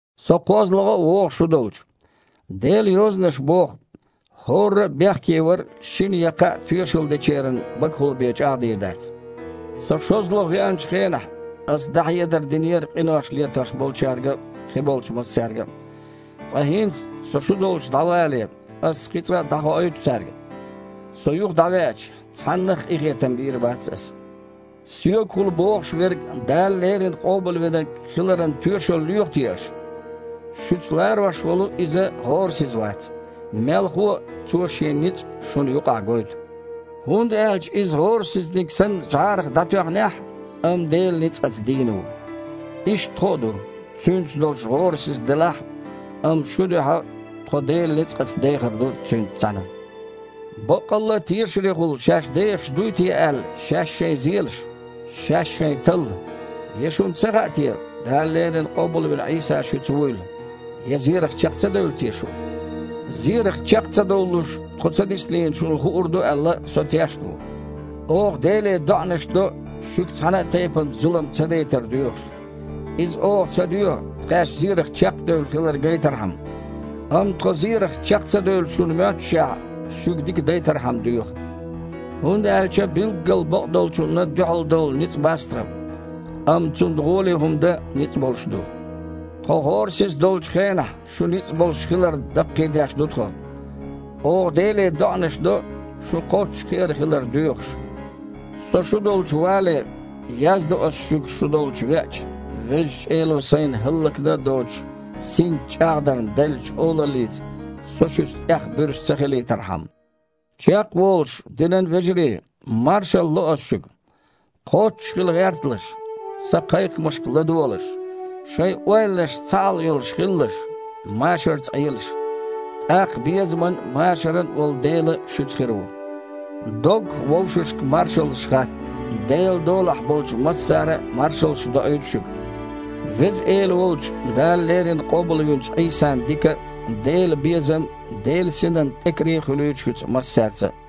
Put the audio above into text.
Со кхозлагІа а вогІу шу долчу. Делан Йозанаша боху: «Шиннан я кхааннан тоьшалло муьлхха а дош чІагІдо». Со шозлагІа веанчу хенахь, аса дІахьедар динера къинош летош болчаьрга а, кхиболчу массаьрга а, ткъа хІинца, со шу долчу дІавале, ас кхин цкъа а дІахоуьйту цаьрга: со юха дІавеача, цхьаннах а къинхетам бийр бац аса. Соьгахула бохуш верг Дала леррина Къобалвинарг хиларан тоьшалла лоьху те аша? Шуьца ларош волу Иза гІорасиза вац. Мелхо а, Цо Шен ницкъ шуна юкъахь гойту. ХІунда аьлча Иза гІорасизниг санна жІарах дІатоьхнехь а, амма Делан ницкъаца дийна ву. Иштта тхо а ду, Цуьнца долуш гІорасиза делахь а, амма шун дуьхьа тхо Делан ницкъаца дехар ду Цуьнца цхьаьна. Баккъалла а тешарехула шаьш дехаш дуй те аьлла, шаьш-шайн зелаш. Шаьш-шайн талла. Я шуна ца хаьа те, Дала леррина Къобалвина Іийса шуьца вуйла? Я зерах чекх ца девлла те шу? Зерах чекх ца довлалуш тхо ца диснийла шуна хуур ду аьлла, со тешна ву. Оха Деле доІанаш до, шуьга цхьана а тайпана зулам ца дайтар доьхуш. Иза оха ца доьху, тхаьш зерах чекхдевлла хилар гайтархьама, амма тхо зерах чекх ца девлла шуна моьттушехь, шуьга дика дайтархьама доьху. ХІунда аьлча билггал бакъдолчунна дуьхьалдовла ницкъ бац тхан, амма цунна гІоле хІума дан ницкъ болуш ду. Тхо гІорасиза долчу хенахь, шу ницкъ болуш хиларна даккхийдеш ду тхо. Оха Деле доІанаш до, шун кхоччуш кхиар хилар доьхуш. Со шу долчу вале, яздо аса шуьга, шу долчу веача, Везачу Эло сайна хІаллакдан а доцуш, синца чІагІдарна деллачу олаллица со шуьца тІех буьрса ца хилийтархьама. Чекхволуш, динан вежарий, маршалла ло ас шуьга! Кхоччуш хила гІерталаш, сан кхайкхамашка ладогІалаш, шайн ойланашца цхьаалла йолуш хилалаш, машарца Іелаш. ТІаккха безаман а, машаран а волу Дела шуьца хир ву. Доггах вовшашка маршаллаш хатта. Делан долахь болчу массара а маршаллаш доуьйту шуьга. Веза Эла волчу, Дала леррина къобалвинчу Іийсан дика а, Делан безам а, Делан Синан тІекаре а хуьлийла шуьца массаьрца а.